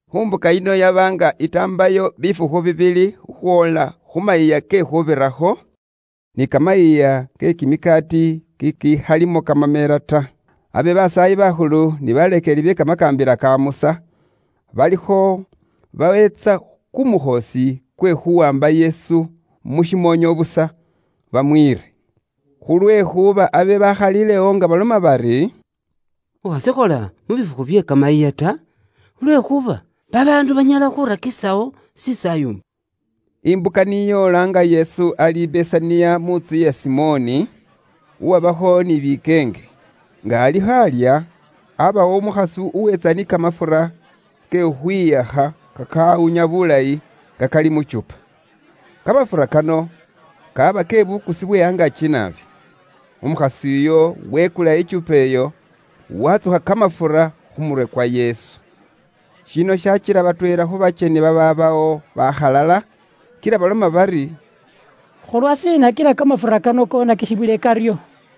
Khu mbuka yino yaba nga itaambayo bifukhu bibili khukhwoola khu Mayiiya ke Khuubirakho, ni Kamayiiya ke Kimikaati kikikhalimo kamamela ta. Abe basaayi bakhulu ni baleekeli be Kamakaambila ka Musa balikho baweentsa kumukhoosi kwe khuwaamba Yesu mu shimoonyo busa, bamwiire. Khulwekhuuba abe bakhalilewo nga baloma bari, “Khukhashikhola mu bifukhu bye kamayiiya ta, khulwekhuuba babaandu banyala khurakikhisawo shisaayumba.” Imbuka ni yoola nga Yesu ali i Besaniya mu ntsu iya Simoni, uwabakho ni bikeenge. Nga alikho alya, abawo umukhasi uwetsa ni kamafura ke khukhwihakha kakawunya bulayi nga kali mu kyupa. Kamafura kano kaaba ke bukusi bwe angaaki naabi. Umukhasi uyo wekula ikyupa iyo, watsukha kamafura khu murwe kwa Yesu. Shino shakila batweela khu bakyeni babaabawo bakhalala, kila baloma bari, “Khulwa shiina kila kamafura kano konakisibwile karyo?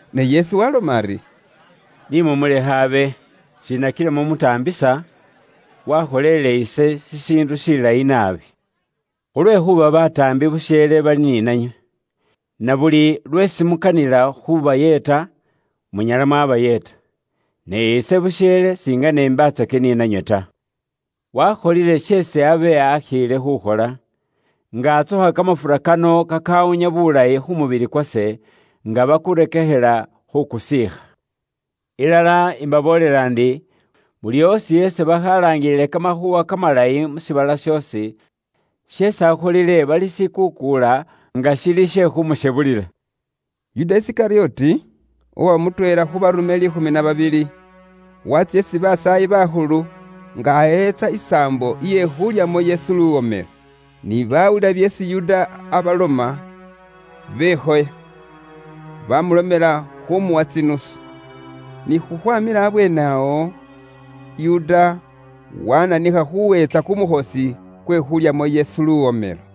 Ne Yesu waabaloma ari, “Ni mumulekhe abe; shiina kila mumutaambisa? Waakholeele ise shishiindu shilayi naabi. Khulwekhuuba bataambi busheele bali ni nanywe. Na buli lweesi mukanila khuubayeeta, munyala mwabayeeta. Ne ise busheele singene imbatsaka ni nanywe ta. Waakholile sheesi abe akhiile khuukhola; nga atsukha kamafura kano kakaawunya buulayi khu mubili kwase nga bakurekekhela khu kusiikha. Ilala imbaboolela ndi, buli oosi isi bakhalaangilile Kamakhuuwa Kamalayi mu shiibala shoosi, sheesi akholile balishikuukuula, nga shili she khuumushebulila.” Yuda Isikalyoti, uwaba mutweela khu baarume liikhumi na babili, waatsya isi basaayi bakhulu nga aweentsa isaambo iye khulyamo Yesu luwomelo. Ni baawulila byeesi Yuda aabaloma, bekhoya, baamulomela khuumuwa tsinusu. Ni khukhwaaamila abweene awo, Yuda waananikha khuweentsa kumukhoosi kwe khulyamo Yesu luwomelo.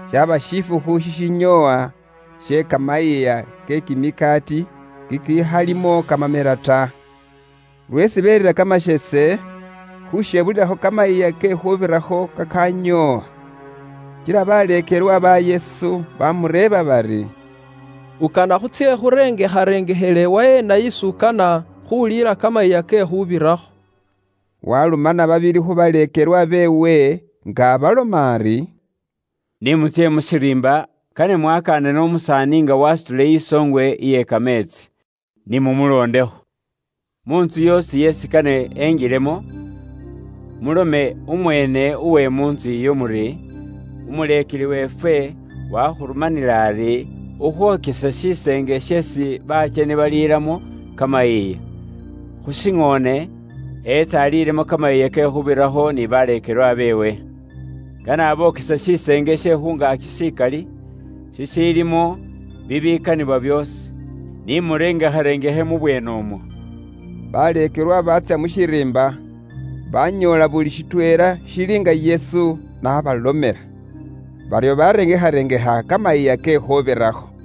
Shaba shifukhu shishinyoowa she Kamayiiya ke Kimikaati kikiikhalimo kamamela ta, lweesi beerira kamasheese, khushebulilakho Kamayiiya ke Khuubirakho kakanyoowa. Kila baleekelwa ba Yesu bamureeba bari, “Ukana khutsye khurengekharengekhele waheena isi ukana khuliila Kamayiiya ke Khuubirakho?” Waarumana babili khu baleekelwa beewe nga abaloma ari, “Ni mutsye mu shiriimba, kane mwakanane umusaani nga wasutile isoongwe iye kameetsi. Ni mumuloondekho. Muntsu yoosi isi kane engilemo, mulome umweene uwe mu ntsu iyo muri, ‘Umuleekeli weefwe wakhurumanile ari ukhwokese shiseenge sheesi bakyeni baliilamo kamayiiya, khushiŋoone, etse aliilemo Kamayiiya ke Khuubirakho ni baleekelwa beewe.’ Kane abokese shiseenge she khungaaki shikali, shishiilimo bibikanibwa byoosi. Ni murengekharengekhe mu bweene umwo.” Baleekelwa baatsya mu shiriimba, banyoola buli shitweela shili nga Yesu n'abalomela. Baryo barengekharengekha Kamayiiya ke Khuubirakho.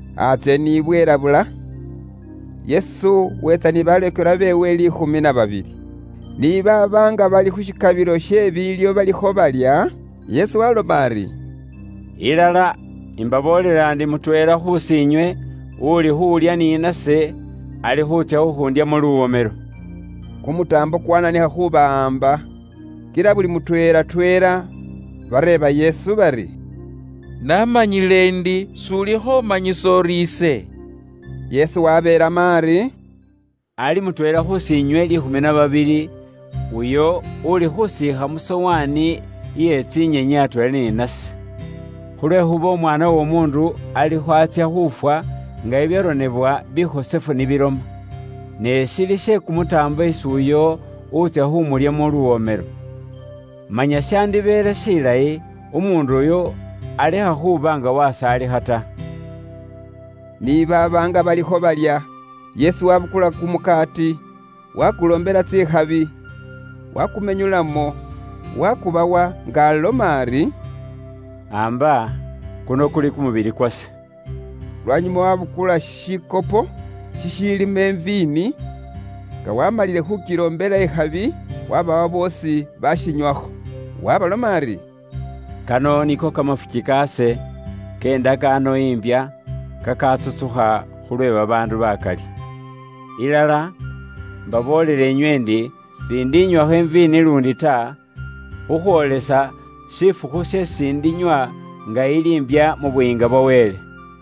Antsye ni bwelabula, Yesu weetsa ni baleekelwa beewe liikhumi na babili. Ni baaba nga bali khu shikabilo she biilyo balikho balya, Yesu waaloma ari, “Ilala, imbaboolela indi mutweela khusi inywe, uli khulya ni nase ali khuutsya khukhundyamo luwomelo.” Kumutaambo kwaananikha khuubawaamba. Kila buli mutweela tweela bareeba Yesu bari, “Manya ulikho umanyisa uri ise?” Yesu wabeelamo ari, “Ali mutweela khusiinywe liikhumi na babili, uyo uuli khuusiikha mu sowaani iye tsinyenyi atweela ni nase. Khulwekhuuba Umwaana w'Omuundu alikho atsya khufwa nga bibyaronebwa bikhosefu ni biloma. Ne shili she kumutaambo isi uyo utsya khumulyamo luwomelo. Manya shandibeele shilayi umuundu uyo alekha khuba nga wasaalikha ta.” Ni baaba nga balikho balya, Yesu waabukula kumukaati, waakuloombela tsikhabi, waakumenyulamo, waakubawa, nga aloma ari, “Amba; kuno kuli kumubili kwase.” Lwanyuma waabukula shikopo shishiilimo iviini, nga waamalile khu kiloombela ikhabi, waabawa boosi bashinywakho. Waabaloma ari, “Kano niko kamafuki kaase, ke indakaano imbya, kakaatsutsukha khulwe babaandu baakali. Ilala, mbaboolela nywe ndi s'indinywakho iviini iye kumusabibu luundi ta, khukhwoolisa shifukhu sheesi ndikinywa nga ili mbya mu Buyiinga bwa Wele.”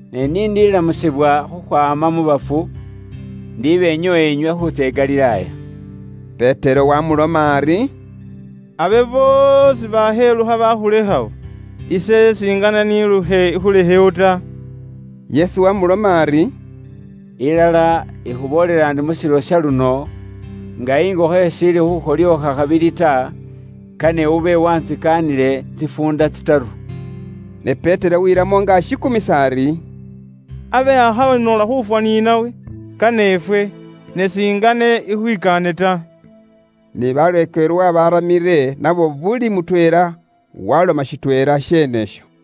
Ne ni ndilamusibwa khukhwaama mu bafu, indi benyoowa inywe khutsya i Galilaaya.” Petero waamuloma ari, “Abe boosi bakhelukha bakhulekhawo, ise s'ingane nilukhe ikhulekhewo ta.” Yesu wamuloma ari, “Ilala, ikhuboolela ndi mu shilo sha luno, nga ingokho ishiili khukholyookha khabili ta, kane ube wantsikaanile tsifuunda tsitaru.” Ne Petero welamo nga ashikumisa ari, “Abe akhaba noola khufwa ni nawe, kane ifwe, ne singane ikhwikaane ta.” Ni baleekelwa babaramile nabo buli mutweela waloma shitweela sheene isho.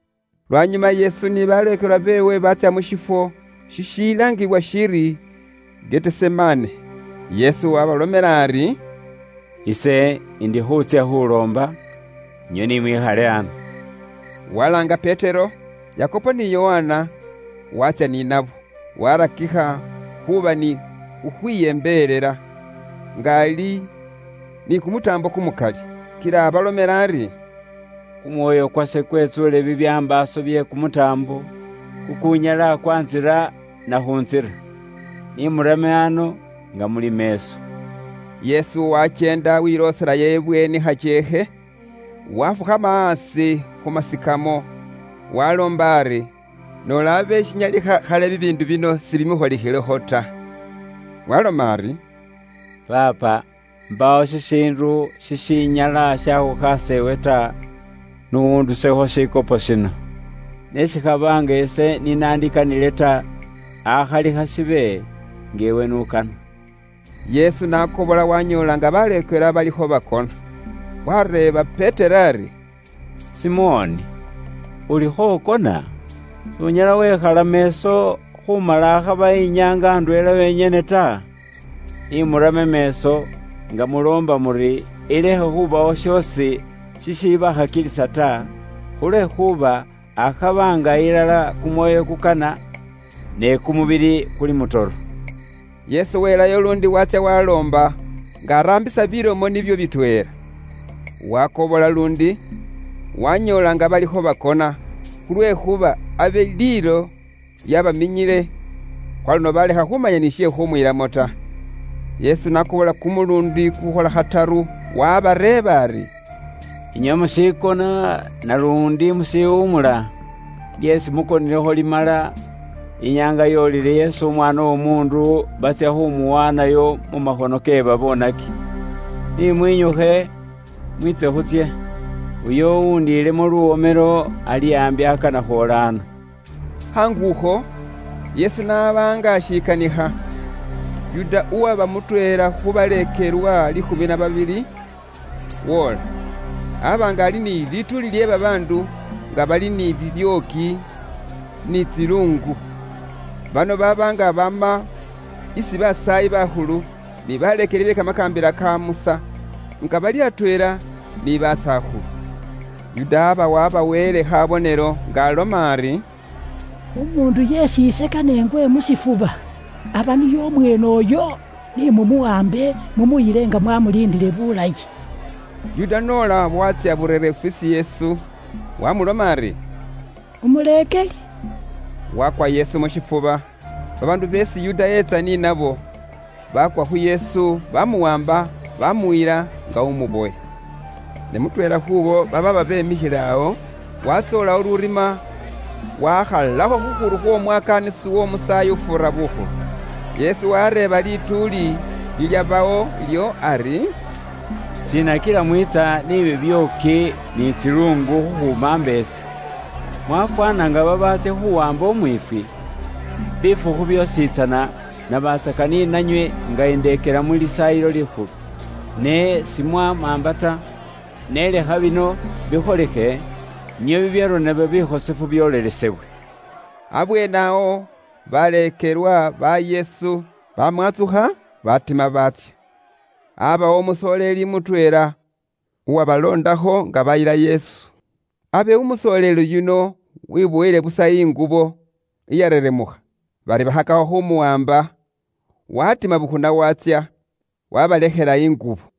Lwanyuma Yesu ni baleekelwa beewe baatsya mu shifwo shishilaangibwa shiri Getisemane. Yesu waabalomela ari, “Ise indi khuutsya khuloomba, inywe ni mwikhale ano.” Walaanga Petero, Yakobo ni Yokana, waatsya ni nabo. Waarakikha khuuba ni khukhwiyembelela, nga ali ni kumutaambo kumukali. Kila abalomela ari, “Kumwoyo kwase kwetsuule bibyambaaso bye kumutaambo, kukuunyala kwaantsira nakhuntsira. Ni murame ano, nga muli meeso.” Yesu wakyeenda welooselayo ibweeni khakyeekhe, waafukhama aasi khu meesikamo, waaloomba ari, noola abe shinyalikha khali bibiindu bino sibimukholikhilekho ta. Waaloma ari, “Abba, Paapa, mbaawo shishiindu shishinyala shaakhukhaasa iwe ta; n'undusekho shikopo shino. Ne shikhaba nga ise ni naandikanile ta, akhali khashibe nga iwe n'ukana.” Yesu n'akobola waanyoola nga baleekelwa balikho bakona. Waareeba Petero ali, “Simoni, ulikho ukona? S'unyala wekhala meeso khuumala akhaba inyaanga indweela yonyene ta? Ni murame meeso nga muloomba muri ilekhe khubawo shoosi shishibakhakilisa ta; khulwekhuuba akhaba nga ilala kumwoyo kukana, ne kumubili kuli kumutoro.” Yesu welayo luundi waatsya waaloomba, nga araambisa bilomo nibyo bitweela. Waakobola luundi, waanyoola nga balikho bakona, khulwekhuuba abe liilo lyaabaminyile; kwaluno baalekha ni khuumanya she khuumwiilamo ta. Yesu n'akobola kumuluundi kukuukhola khataru, waabareeba ari, “Inywe mushikona naluundi mushiwumula? Lyeesi mukonilekho limala; inyaanga yoolile isi Umwaana w'Omuundu batsya khumuwaanayo mu makhono ke baboonaki. Ni mwinyukhe, mwiitse khutsye, uyo uwundilemo luwomelo ali aambi akana khwoola ano.” Khaangukho, Yesu n'aba nga ashikanikha, Yuda uwaba mutweela khu baleekelwa liikhumi na babili, woola. Aba nga ali ni lituuli lye babaandu nga bali ni bibyooki, ni tsiluungu. Bano baaba nga baama isi basaayi bakhulu, ni baleekeli be kamakaambila ka Musa nga bali atweela ni basakhulu. Yuda yaba wabaweele khabonelo nga aloma ari, “Umuundu yeesi ise kane ingwe mu shifuba aba niye umweene uyo; ni mumuwambe mumuyile nga mwamuliindile bulayi.” Yuda n'ola waatsya burereefu isi Yesu, wamuloma ari, “Umuleekeli!” Wakwa Yesu mu shifuba. Babaandu beesi Yuda eetsa ni nabo baakwa khu Yesu, baamuwaamba, baamuyila nga umubowe. Ne mutweela khuubo babaaba beemikhile awo, waatsowolayo lurima, waakhalakho khukhuru khw'omwakaanisi w'omusaayi ufuura bukhulu. Yesu wareeba lituuli lilyabawo ilyo ari, “Shiina kila mwiitsa ni bibyooki ni tsiluungu khukhumaamba ise, mwafwaana nga babaatsya khuwaamba umwiifwi? Bifukhu byoositsana nabatsaka ni nanywe nga indeekela mu Lisaayilo Likhulu, ne simwamaamba ta. Ne lekha bino bikholikhe nio bibyaronebwa bikhosefu byoolelesebwe.” Abweene awo baleekelwa ba Yesu bamwantsukha, batima baatsya. Aabawo umusoleeli mutweela uwabaloondakho nga bayila Yesu. Abe umusoleeli yuno webowele busa ingubo iyareremukha. Bari bakhakakho khuumuwaamba, waatima bukhuna waatsya, waabalekhela ingubo.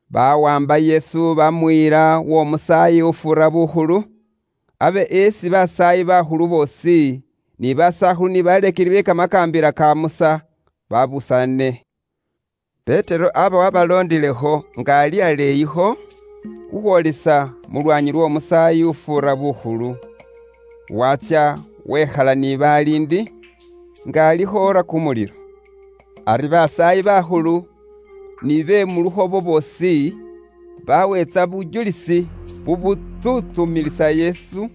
Bawaamba Yesu baamuyila w'omusaayi ufuura bukhulu, abe isi basaayi bakhulu boosi, ni basakhulu ni baleekeli be Kamakaambila ka Musa babusaane. Petero aba wabaloondilekho nga ali aleeyikho, khukhwoolisa mu lwaanyi lw'omusaayi ufuura bukhulu. Watsya wekhala ni baliindi, nga alikho oora kumulilo. Ari basaayi bakhulu ni be mu lukhobo boosi, baweentsa bujulisi bubutsuntsumilisa Yesu,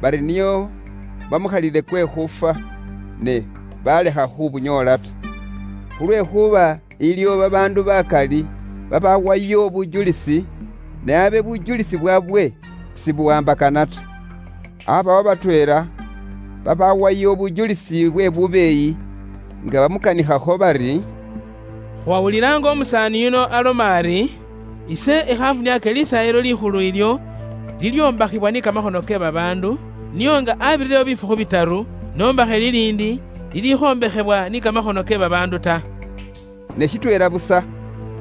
bari nio bamukhalile kwe khufwa, ne baalekha khu bunyoola ta. Khulwekhuuba iliwo babaandu bakali babaawayo bujulisi, ne abe bujulisi bwaabwe sibuwaambakana ta. Aabawo batweela babaawayo bujulisi bwe bubeeyi nga bamukanikhakho bari, “Khwawulila nga umusaani yuno aloma ari, ‘Ise ikhafuniake Lisaayilo Likhulu ilyo lilyombakhibwa ni kamakhono ke babaandu, nio nga abirirewo bifukhu bitaru, nombakhe liliindi, lilikhombekhebwa ni kamakhono ke babaandu ta.’” Ne shitweela busa,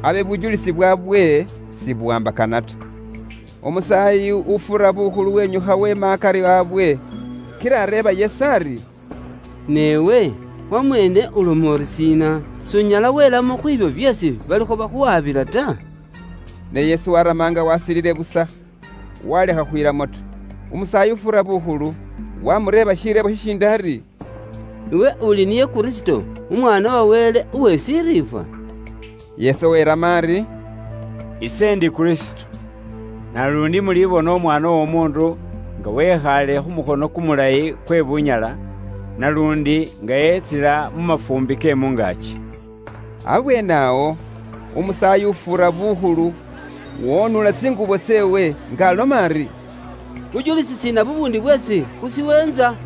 abe bujulisi bwaabwe sibuwaambakana ta. Umusaayi ufuura bukhulu wenyukha wema akari abwe, kila areeba Yesu ari, “Ne iwe wamweene uloma uri shiina? S'unyala welamo khwibyo byeesi balikho bakhuwabila ta?” Ne Yesu warama nga wasilile busa, walekha khukhwilamo ta. Umusaayi ufuura bukhulu wamureeba shireebo shishindi ari, “Iwe uli niye Kristo, Umwaana wa Wele uwe Shiriifwa?” Yesu welamo ari, “Ise indi Kristo; naluundi mulibona Umwaana w'Omuundu nga wekhaale khu mukhono kumulayi kwe Bunyala, naluundi nga etsila mu mafuumbi ke mu ngaaki.” Abweene awo, umusaayi ufuura bukhulu wonuula tsingubo tseewe, nga aloma ari, “Bujulisi shiina bubuundi bweesi khushiweentsa?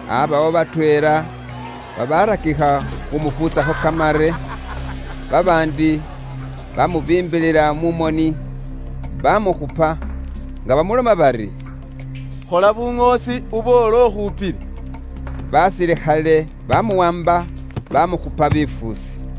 Aabawo batweela babarakikha khumufuutsakho kamare, babaandi baamubiimbilila mu moni, baamukhupa, nga bamuloma bari, “Khola buŋoosi uboole ukhupile.” Basilikhale baamuwaamba baamukhupa bifuusi.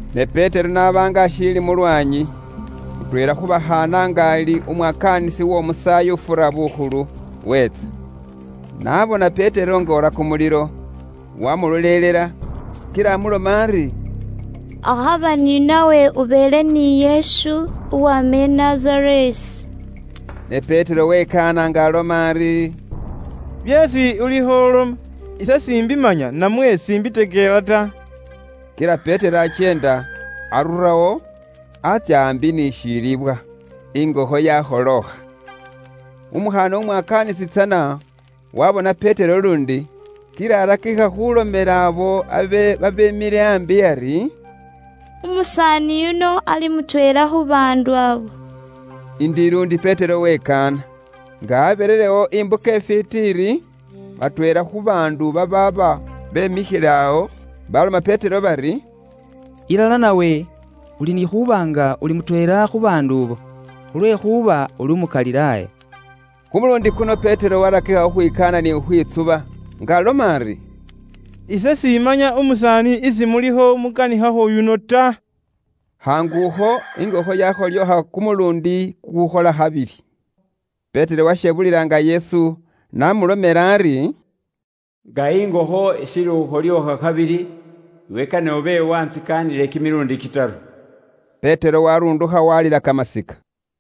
Ne Petero n'aba nga ashiili mu lwaanyi, mutweela khu bakhaana nga ali umwakaanisi uw'omusaayi ufuura bukhulu, wetsa. N'abona Petero nga oora kumulilo, wamulolelela, kila amuloma ari, “Akhaba ni nawe ubeele ni Yesu uwama i Nazareesi.” Ne Petero wekaana nga aloma ari, “Byeesi ulikho uloma, ise s'imbimanya namwe s'imbitekela ta.” Kila Petero akyeenda arurawo atsya aambi ni shilibwa. Ingokho yakholookha. Umukhaana umwakaanisi tsana waabona Petero luundi, kila arakikha khuulomela abo abe babeemikhile ambi ari, “Umusaani yuno ali mutweela khu baandu abo.” Indi luundi Petero wekaana. Nga abirirewo imbuka ifwiiti iri, batweela khu baandu babaaba bemikhile awo, baloma Petero bari, “Ilala nawe uli ni khuuba nga uli mutweela khu baandu abo; khulwekhuuba uli umu Galilaaya.” Kumuluundi kuno Petero warakikha khukhwikaana ni khukhwitsuba, nga aloma ari, “Ise simanya umusaani isi mulikho mukanikhakho uyuno ta.” Khaangukho, ingokho yakholookha kumuluundi kukukhola khabili. Petero washebulila nga Yesu n'amulomela ari, “Nga ingokho ishiili khukholyookha khabili, iwe kane ube wantsikaanile kimiluundi kitaru.” Petero warundukha walila kamasika.